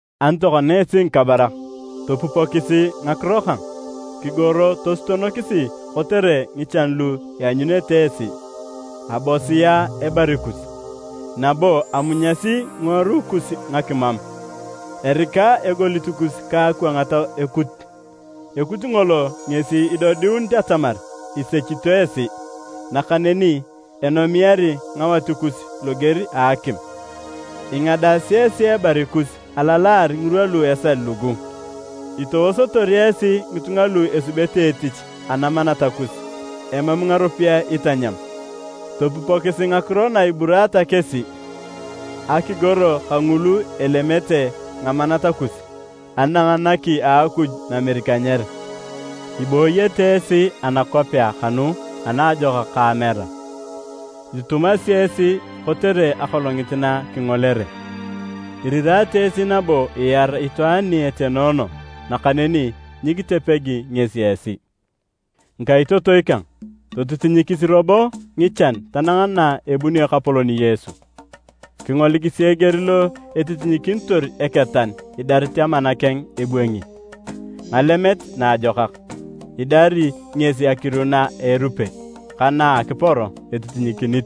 Ani tokona esi ngikabarak, topupokisi ngakiro kang! Kigoro tosutonokis kotere ngichan lu ianyunete esi! Abosia ebari kus, nabo amunyasi ngiworui kus ngakimam. Erika egolit kus ka akwangat ekut. Ekut ngolo ngesi idodiuni atamar isechito esi, nakaneni enomiari ngawat kus loger a akim. Ingadaasi esi ebari kus alalaar ngirwa lu esal lugu. Itowosotor esi ngitunga lu esubete etich anamanat kus emam ngaropiyae itanyam. Topupokisi ngakiro na iburaata kesi! Akigoro kangulu elemete ngamanat kus, anang naki a Akuj Namerikanyer. Ibooyete esi anakwapea kanu anajako ka amera, itutumasi esi kotere akolongit na kingolere. Irirata esi nabo iar itwaan ni etenoono nakaneni nyikitepegi ngesi esi. Ngikaitotoi kang, totitinyikisi robo ngichan tanang na ebunio Ekapolon Yesu. Kingolikisi eger lo etitinyikinitor eketan idarit amana keng ebwangi ngalemet naajokak. Idari ngesi akiru na a erupe ka na a akiporo etitinyikinit.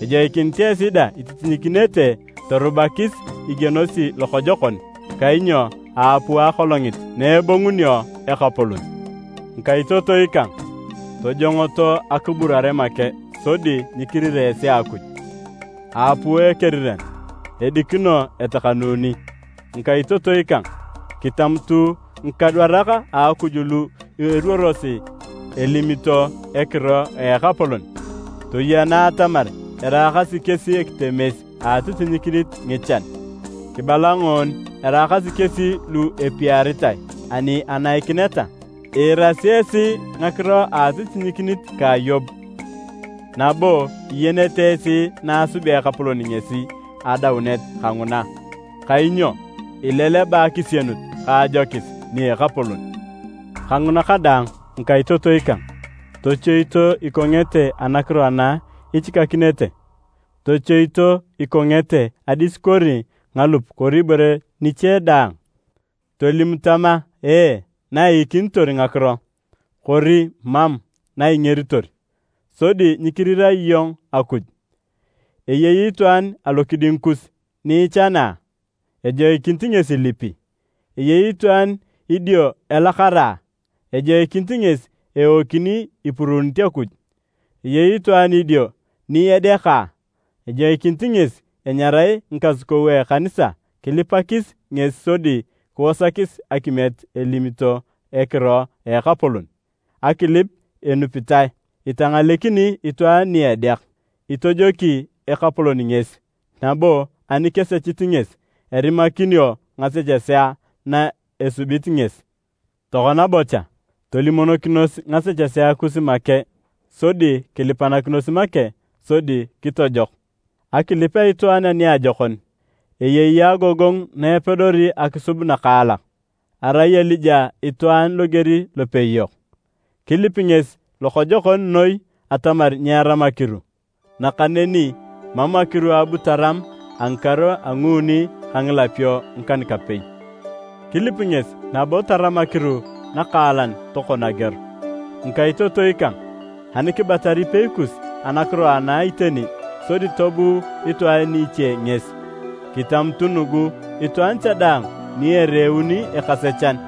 Ejoikinit esi dang ititinyikinete. Torubakisi igienosi lokojokon, kainyo aapuu akolongit na ebongunio Ekapolon. Ngikaitotoi kang, tojongoto akiburare make sodi nyikirira esi Akuj. Aapuu Ekeriran, edikino etakanuni. Ngikaitotoi kang, kitamutu ngikadwarak a Akuj lu eruorosi elimito ekiro a Ekapolon. Toyena atamar eraakasi kesi ekitetemes a atitinyikinit ngichan. Kibala ngoni araakasi kesi lu apiaritae ani anaikineta. Iirasi esi ngakiro a atitinyikinit ka Yob, nabo iyenete esi na asubea Ekapolon ngesi adaunet kanguna. Kainyo ileleba akisienut ka ajokis nia Ekapolon. Kanguna kadaang ngikaitotoi kang, tochoito ikongete anakiro ana ichikakinete. Tochoito ikongete adis kori ngalup kori ibore niche daang. Tolim tama, “Ee” na iikinitor ngakiro, kori “Mam” na ingeritor, sodi nyikirira iyong Akuj. Eyei itwaan alokiding kus ni ichana a? Ejoikinit ngesi ilipi. Eyei itwaan idio elakara a? Ejoikinit ngesi eokini ipuruunit Akuj. Eyei itwaan idio ni edeaka? Ejoikinit ngesi enyarae ngikasukou a ekanisa kilipakis ngesi sodi kiwasakis akimiet elimito ekiro a Ekapolon. Akilip enupitae itangalekini itwaan ni edeak, itojoki Ekapolon ngesi, nabo ani kesechit ngesi, erimakinio ngasechesea na esubit ngesi. Tokona bocha, tolimonokinos ngasechesea kus make sodi kilipanakinos make sodi kitojok. Akilip a itwaan aniajokon, eyei agogongu na epedori akisub nakaalak. Arai Elija itwaan loger lopei yok. Kilip ngesi lokojokon noi atamar nyeeram akiru, nakaneni mam akiru abu taram a ngikaru a nguuni ka ngilapio ngikan-kapei. Kilip ngesi nabo taram akiru nakaalan tokon ageor. Ngikaitotoi kang! Ani kibatar ipei kus anakiro ana iteni sodi tobuu itwaan iche ngesi, kitamutu nugu, itwaan cha daang ni ereuni ekasechan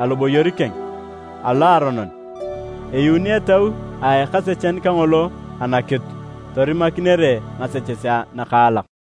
aloboyor keng aloaronon, eyuuni etau a ekasechan kangolo anakitu torimakinere ngasechesea nakaalak.